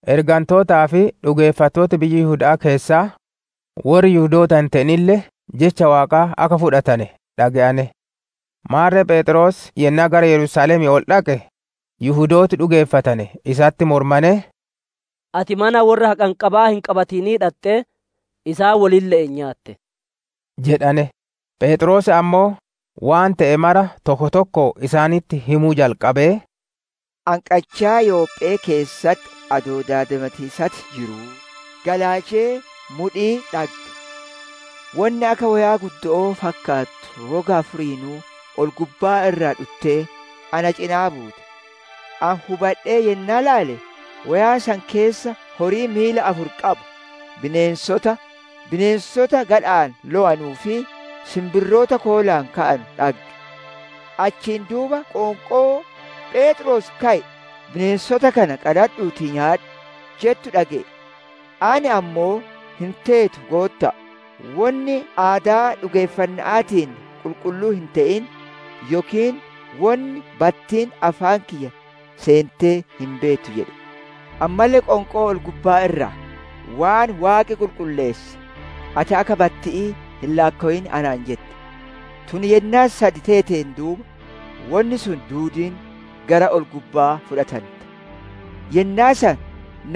Ergantootaa fi dhugeeffattooti biyya Yihuda'aa keessaa, worri Yihudoota hin te'inille Jecha Waaqaa akka fudhatane dhage'ane. Maarre Pheexroos yennaa gara Yerusaalemii ol dhaqe, Yihudooti dhugeeffatane isatti mormanee, «Ati mana worra haqanqabaa hin qabatinii dhaxxee, isaan wolille'een nyaatte» jedhane. Pheexroos ammoo, waan te'e mara tokko tokkoon isaanitti himuu jalqabee: «Ani qachaa Yophe'ee keessatti adoo daadimatiisatti jiruu, galaalchee mudhii dhagge. Wonni akka woyaa guddo'oo fakkaattu roga afuriinuu ol gubbaa irraa dhuttee, na cinaa buute. Ani hubadhee yennaa ilaale, woyaa san keessa horii miila afur qabu, bineensota, bineensota gadha'aan lowanuu fi sinbirroota koolaan ka'anu dhagge. Achiin duuba qoonqoo, ‹Pheexroos, ka'i; bineensota kana qaladhuutii nyaadhu!› jettu dhage'e. Ani ammoo, ‹Hin teetu, Gootta'a! Wonni aadaa dhugeeffanna'aatiin qulqulluu hin te'in yookiin wonni battiin afaan kiyya seentee hin beettu› jedhe. Ammalle qoonqoon ol-gubbaa irraa, ‹Waan Waaqi qulqulleesse, ati akka batti'ii hin laakkowin› anaan jette. Tun yennaa sad teeteen duuba, wonni sun duudiin gara ol-gubba'aa fudhatante. Yennaa san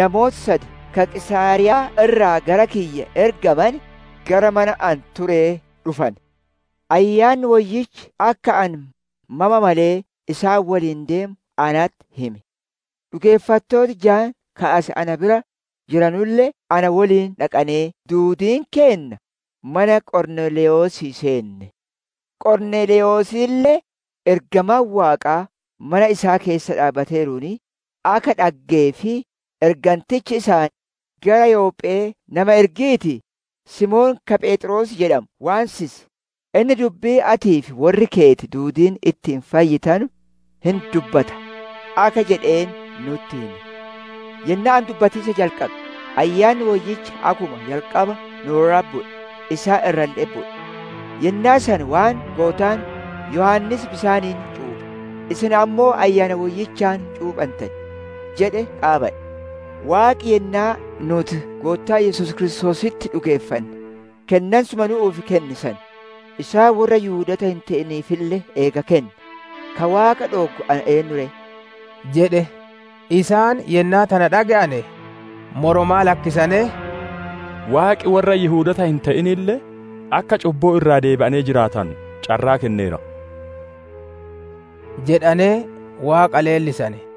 namooti sad ka Qiisaariyaa irraa gara kiyya ergamane, gara mana ani turee dhufane. Ayyaanni Woyyichi akka ani mama malee isaan woliin deemu natti hime. Dhugeeffattooti jaan ka as na bira jiranulle na woliin dhaqanee, duudiin keenna mana Qorneelewosii seenne. Qorneelewosille, ergamaan Waaqaa mana isaa keessa dhaabbateeruun akka dhaggee fi ergantichi isaan, ‹Gara Yophe'ee nama ergiitii, Simoon ka Pheexroos jedhamu waansisi; inni dubbii atii fi worri keeti duudiin ittiin fayyitanu hin dubbata› akka jedheen nutti hime. Yennaa ani dubbatiisa jalqabe, Ayyaanni Woyyichi akkuma jalqaba nu irratti bu'e, isaan irralle'etti bu'e. Yennaa san waan Goottaan, ‹Yohaannis bisaaniin cuuphe, isin ammoo Ayyaana Woyyichaan cuuphantan› jedhe qaabadhe. Waaqi yennaa nuuti Goottaa Yesuus Kiristoositti dhugeeffanne kennansuma nu'uuf kenne san, isaan worra Yihudoota hin te'iniifille eega kenne, ka Waaqa dhooggu ani eennu ree?» jedhe. Isaan yennaa tana dhage'ane, moromaa lakkisanee, «Waaqi worra Yihudoota hin te'inille akka cubbuu irraa deebi'anee jiraatanu carraa kenneera» jedhanee Waaqa leellisane.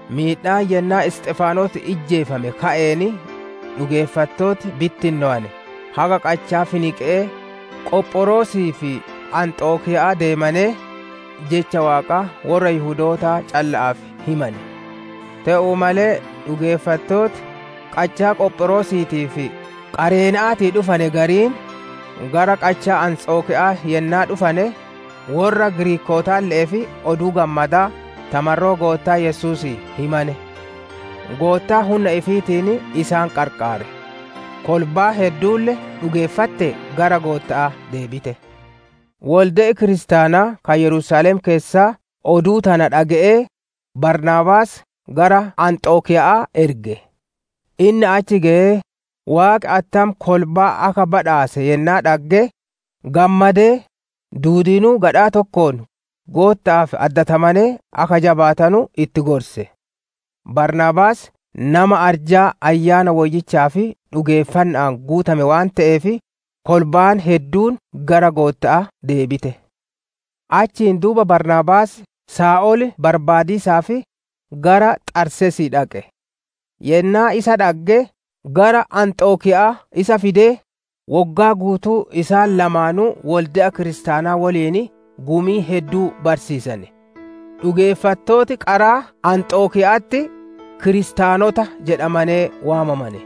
Miidhaa yennaa Isxifaanos ijjeefame ka'een, dhugeeffattooti bittinnowane haga qachaa Finiqee, Qophiroosii fi Anxokiyaa deemanee, Jecha Waaqaa worra Yihudootaa calla'aaf himane. Te'uu malee dhugeeffattooti qachaa Qophiroosiitii fi Qareena'aatii dhufane gariin, gara qachaa Anxokiya'aa yennaa dhufane, worra Giriikootaalle'eef Oduu Gammadaa ta marroo Goottaa Yesuusii himane. Goottaan hunna ifiitiin isaan qarqaare; kolbaan hedduulle dhugeeffattee gara Gootta'aa deebite. Wolde'i kiristaanaa ka Yerusaalem keessaa oduu tana dhage'ee, Baarnaabaas gara Anxokiya'aa erge. Inni achi geyee, Waaqi attam kolbaa akka badhaase yennaa dhagge, gammadee, duudiinuu gadhaa tokkoon Gootta'aaf addatamanee akka jabaatanu itti gorse. Baarnaabaas nama arjaa Ayyaana Woyyichaa fi dhugeeffanna'aan guutame waan te'eef, kolbaan hedduun gara Gootta'aa deebite. Achiin duuba Baarnaabaas Saa'ol barbaadiisaaf gara Xarseesii dhaqe. Yennaa isa dhagge gara Anxokiya'aa isa fidee, woggaa guutuu isaan lamaanuu wolde'a Kiristaanaa woliin gumii hedduu barsiisane. Dhugeeffattooti qaraa Anxokiya'atti, «Kiristaanota» jedhamanee waamamane.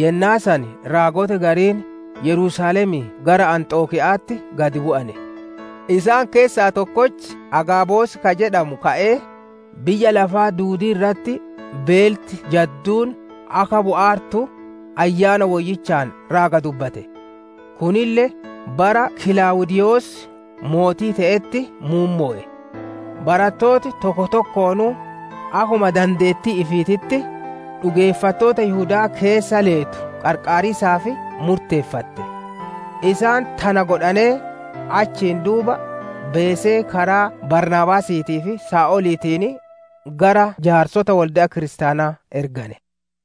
Yennaa san raagoti gariin Yerusaalemii gara Anxokiya'atti gad bu'ane. Isaan keessaa tokkochi Agaabos ka jedhamu ka'ee, biyya lafaa duudii irratti beelti jadduun akka bu'aartu, Ayyaana Woyyichaan raaga dubbate; kunille bara Kilaawudiiyos mootii te'eerutti muummowe. Barattooti tokko tokkoonuu akkuma dandeettii ifiititti, dhugeeffattoota Yihudaa keessa leetu qarqaariisaaf murteeffatte. Isaan tana godhanee, achiin duuba beesee karaa Baarnaabaasiitii fi Saa'oliitiin gara jaarsota wolde'a Kiristaanaa ergane.